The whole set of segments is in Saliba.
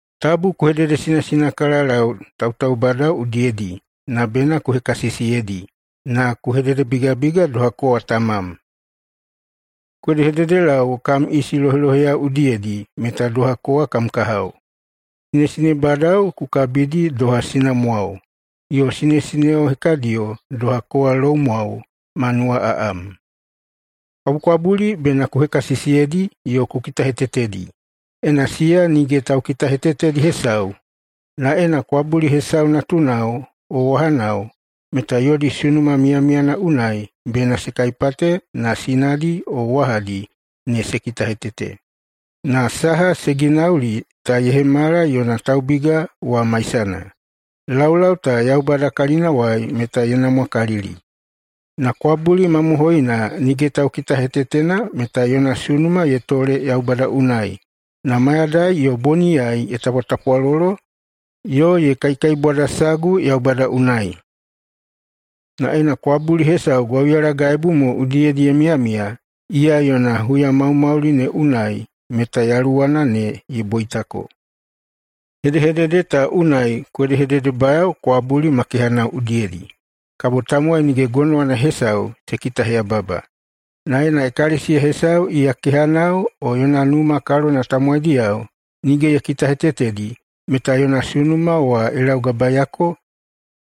Tabu ku hededesinasinakalalau tautaubadao udiyedi na bena ku hekasisiyeidi na ku hededebigabiga doha kowa tamam. Ku hedehededelau kam isi loheloheyao udiyedi meta doha kowa kam kahao. Sinesinebadao ku kabidi doha sinamwao, yo sinesineo hekadiyo doha kowa loumwao, ma nuwaꞌaꞌam. Kwabukwabuli bena ku hekasisiyeidi yo ku kitahetetedi, ena siya nige taukitahetetedi hesau. Na ena kwabuli hesau natunao o wahanao, meta yodi sunuma miyamiyana unai bena se kaipate na sinadi o wahadi ne se kitahetete. Na saha se ginauli ta ye hemala yona taubiga wa maisana. Laulau ta Yaubada kalinawai meta ye namwakalili. Na kwabuli mamohoina nige taukitahetetena meta yona sunuma ye tole Yaubada unai na mayadai yo boniyai ye tapwatapwalolo yo ye kaikaibwadasagu Yaubada unai. Na ena kwabuli hesau gwauyalagaibu mo udiyedi ye miyamiya, iya yona huyamaumauli ne unai meta yaluwana ne ye boitako. Hedehedede ta unai ku hedehededebayao kwabuli ma kehanao udiyedi, kabo tamowai nige gonowana hesau se kitaheyababa. Na ena ekalesiya hesau iya kehanao o yona numa kalona tamowaidiyao nige ye kitahetetedi, meta yona sunuma wa ye laugabaeiyako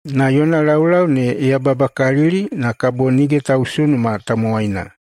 na yona laulau ne ye yababakalili na kabo nige tausunuma tamowaina.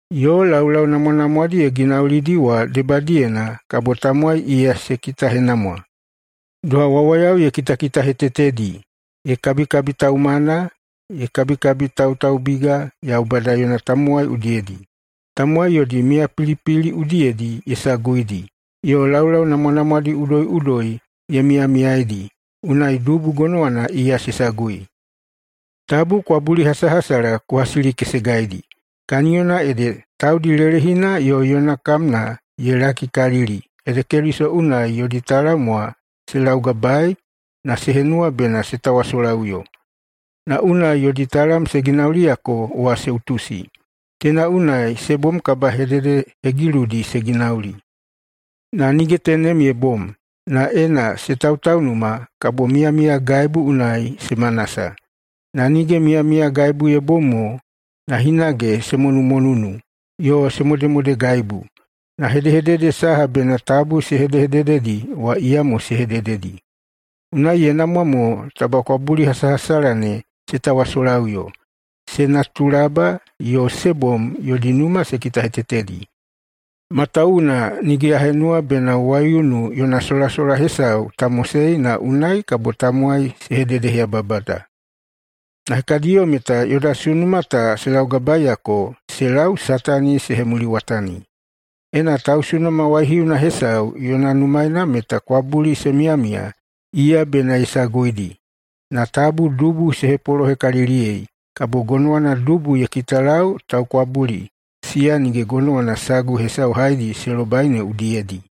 yo laulau namwanamwadi ye ginaulidi wa debadiyena kabo tamowai iya se kitahenamwa, doha wawayao ye kitakitahetetedi, ye kabikabitaumana, ye kabikabitautaubiga Yaubada yona tamowai udiyedi, tamowai yodi miyapilipili udiyedi ye saguidi, yo laulau namwanamwadi udoiꞌudoi ye miyamiyaidi, unai dubu gonowana iya se sagui. Tabu kwabulihasahasala ku hasilikesegaidi, kaniyona ede taudi lelehina yo yona kamna ye lakikalili ede Keliso unai yodi talam wa se laugabaei na se henuwa bena se tawasolaꞌuyo. Na unai yodi talam se ginauliyako wa se utusi. Teina unai se bom kabahededehegiludi se ginauli. Na nige tenem ye bom. Na ena se tautaunuma kabo miyamiyagaibu unai se manasa. Na nige miyamiyagaibu ye bom mo, na hinage se monumonunu yo se modemodegaibu, na hedehedede saha bena tabu se hedehedededi wa iyamo se hedededi. Unai ye namwa mo taba kwabulihasahasala ne se tawasolaꞌuyo, se natulaba, yo se bom yodi numa se kitahetetedi, matawuwuna nige ya henuwa bena waiunu yona solasola hesau ta mosei na unai kabo tamowai se hededeheyababada. Na hekadiyo meta yoda sunuma ta se laugabaeiyako se lau Satani se hemuliwatani. Ena tausunuma waihiuna hesau yona numaena meta kwabuli se miyamiya, iya bena ye saguidi. Na tabu dubu se hepolohekaliliyei, kabo gonowana dubu ye kitalau taukwabuli siya nige gonowana sagu hesau haedi se lobai ne udiyedi.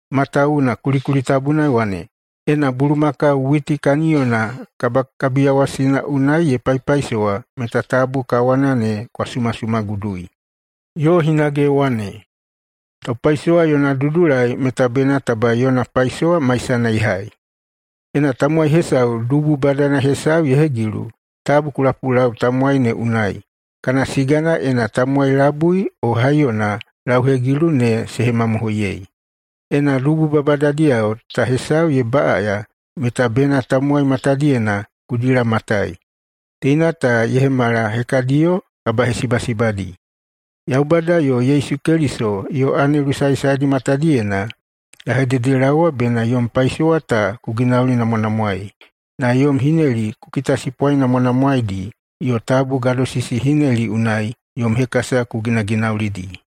Matawuwuna kulikuli tabuna ye wane, “Ena bulumakau witi kaniyona kabakabiyawasina unai ye paipaisowa meta tabu kawana ne kwa sumasumagudui.” Yo hinage ye wane, “Taupaisowa yona dudulai meta bena taba yona paisowa maisana ye hai.” Ena tamowai hesau dubu badana hesau ye hegilu, tabu ku lapulau tamowai ne unai, kana sigana ena tamowai labui o haiyona lauhegilu ne se hemamohoiyei. Ena dubu babadadiyao ta hesau ye baꞌaya, meta bena tamowai matadiyena ku dilamatai. Teina ta ye hemala hekadiyo kabahesibasibadi. Yaubada yo Yesu Keliso yo anelu saesaedi matadiyena ya hededelaowa bena yom paisowa ta ku ginaulinamwanamwaei, na yom hineli ku kitasipwanamwanamwaeidi yo tabu gadosisihineli unai yom hekasa ku ginaginaulidi.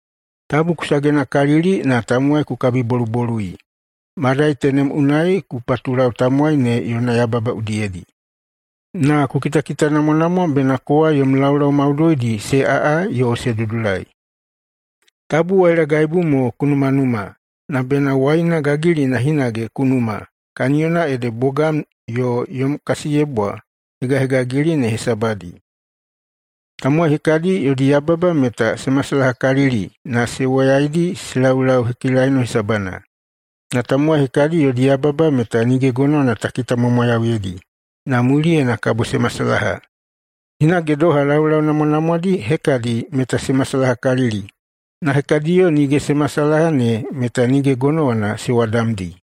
Tabu ku sagenakalili na tamowai ku kabibolubolui, madai tenem unai ku patulau tamowai ne yona yababa udiyedi. Na ku kitakitanamwanamwa bena kowa yom laulau maudoidi se aꞌa yo se dudulai. Tabu wailagaibu mo ku numanuma, na bena waina gagilina hinage ku numa, kaniyona ede bogam yo yom kasiyebwa hegahegagili ne hesabadi. Tamowai hekadi yodi yababa meta se masalahakalili na se woyaidi se laulau hekilaino hesabana. Na tamowai hekadi yodi yababa meta nige gonowana ta kitamwamwayauyeidi, na muliyena kabo se masalaha. Hinage doha, laulau namwanamwadi hekadi meta se masalahakalili, na hekadiyo nige se masalaha ne meta nige gonowana se wadamdi.